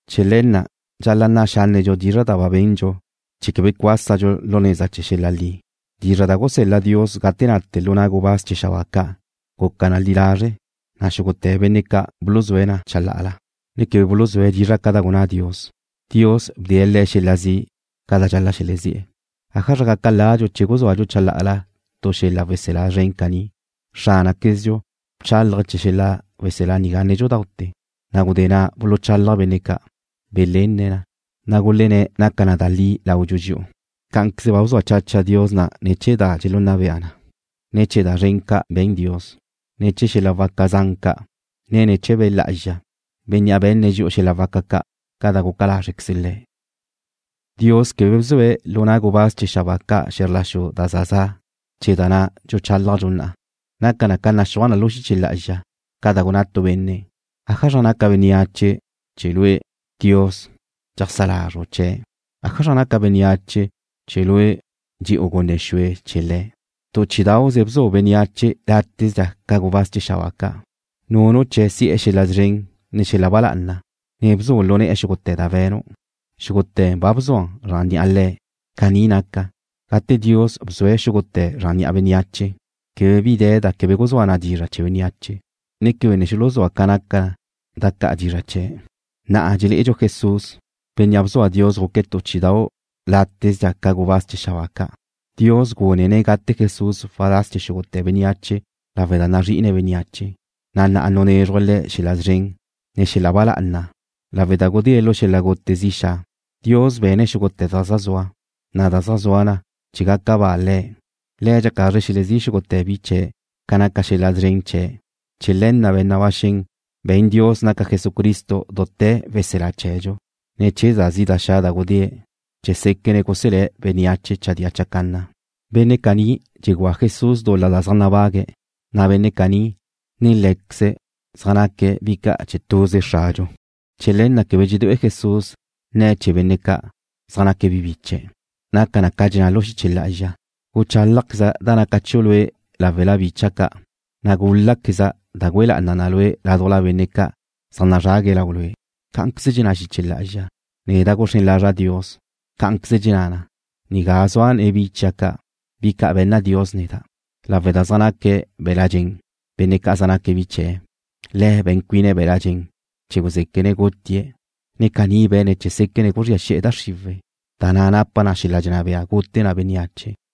Chee̱ le̱ na' dxal-la' nna' xánnedxu dizra' da ba bendxu chee̱ quebe cuásadxu lu neza chee̱ xel-la' li. Dizra' da gusel-la Dios gate nate lu na' gubáz chee̱ xabáa ca' guca na li lazre', na' xúgute̱ benne' ca' buluzúe̱' na chalá'ala, ne quebe buluzúe̱' dizra' ca da gunná Dios, Dios bdee̱' le̱' xel-la' zi' ca da dxal-la' xelezí'e̱. ¿Ájazra gaca ladxu che guzúadxu chalá'ala tu xel-la' weselá zren caní? Xránaquezdxu bchálaje̱' chee̱ xel-la' weselá nigá nédxute̱, na' gudé na' buluchálaj benne' ca' belenne̱' na, na' gulenné̱' naca na da li laudxu dxi'u. Cá'anqueze ba bzua chacha Dios na ne̱ chee̱ da dxelunna bea na, ne ne̱ chee̱ da zren ca' be̱n Dios, ne ne̱ chee̱ xel-la' waca zan ca', ne ne̱ chee̱ Be' Lá'azxa, Bénnea' be̱nne̱' dxi'u xel-la' waca ca', ca da guca lázrequeze Le̱'. Dios quebe bzue̱' lu na' gubáz chee̱ xabáa ca' xe̱zr la xu da za za', chee̱ da na' dxuchálajdxu na'a. Naca na ca naxúaj na lu xiche lá'azxa, ca da gunná tu benne': ¿Ájazra naca bénneache che Lue', Dios, dxeajsá lazru' chee̱'? ¿Ájazra naca bénneache, che Lue' dxe'u gunne xue chee̱ le̱'? Tu chí'idau'ze bzu' bénneache látezdxa ca gubáz chee̱ xabáa ca'. Nunu' chee̱' si'e̱ xel-la' szren, ne xel-la' ba lá'ana, ne bzu' lu ne̱'e̱ xúgute̱ da be̱nu'. Xúgute̱ ba bzu' na zran ni'a le̱'. Caní naca, gate Dios bzue̱' xúgute̱ zran ni'a bénneache, quebe bi de̱ da quebe guzúa na dizra' chee̱ bénneache, na' quebe ne xuluzúa ca naca da ca' dizra' chee̱'. Na'a dxelé'edxu Jesús, Bénnea' bzua Dios guque̱' tu chí'idau' látezdxa ca gubáz chee̱ xabáa ca'. Dios gúnene̱' gate Jesús waláz chee̱ xúgute̱ bénneache lawe' da nazri'ine̱' bénneache, na' na'a nunézruje̱' Le̱' xel-la' szren, ne xel-la' ba lá'ana lawe' da gudée̱' lu xel-la' gute zi xa'. Dios be̱ne̱' xúgute̱ da zaj zua, na' zaj zua na chee̱ gaca ba Le̱'. Le̱' dxaca lazre̱' xelezí' xúgute̱ bi chee̱' ca naca xel-la' szren chee̱'. Chee̱ le̱ na' be̱n na ba xen be̱n Dios naca Jesucristo dute̱ weselá chee̱dxu, ne̱ chee̱ da zi' da xa' da gudée̱' chee̱ séquene̱' guselé̱' bénneache chadía chacanna. Benne' caní dxegúa Jesús dul-la da zaj nabague̱', na' be̱nne' caní, ne Lé̱queze̱' zaj naque̱' bi ca' chee̱ tuze Xradxu. Chee̱ le̱ na' quebe dxedué'e Jesús nne̱' chee̱ benne' ca', zaj naque̱' bi biche̱'. Naca na ca dxenná lu xiche lá'azxa: Guchálajqueza' da naca chiu' Lue' láwela bicha' ca', na' gúl-laqueza' da güe lá'ana' Lue' ládujla benne' ca' zaj nazrague̱' lau Lue'. Cá'anqueze dxenná xiche lá'azxa: Neda' guxrén lazra' Dios. Cá'anqueze dxenná na: Nigá zua' nen bi chia' ca', bi ca' be̱nna Dios neda'. Lawe' da zaj naca be̱la' dxen benne' ca' zaj naque̱' bi chee̱', Le̱' be̱n cuine̱' be̱la' dxen chee̱ guzéquene̱' gutie̱', ne caní be̱ne̱' chee̱ séquene̱' guzría xi'e̱ da xriwe̱', da na' napa na xel-la' dxenná bea gute na bénneache.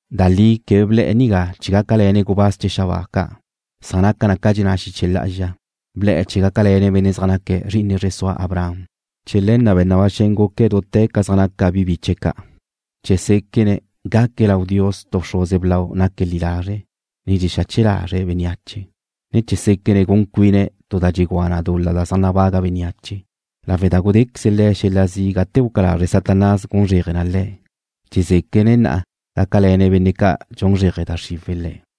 Da li quebe ble̱'e̱ nigá chee̱ gácale̱ne̱' gubáz chee̱ xabáa ca', san naca na ca dxenná xiche lá'azxa: Ble̱'e̱ chee̱ gácale̱ne̱' benne' zaj naque̱' zri'ine zre sua Abraham. Chee̱ le̱ na' be̱n na ba xen guque̱' dute̱ ca zaj naca bi biche̱' ca', chee̱ séquene̱' gaque̱' lau Dios tu bxruze blau naque̱' li lazre', ne dxexache lazre̱' bénneache, ne chee̱ séquene̱' gun cuine̱' tu da dxegúa na dul-la zaj nabaga bénneache. Lawe' da gudéqueze Le̱' xel-la' zi' gate guca lazre Satanás gun zréaje Le̱', dxezéquene̱' na'a gácale̱ne̱' benne' ca' dxun zréaje da xriwe̱' le̱'.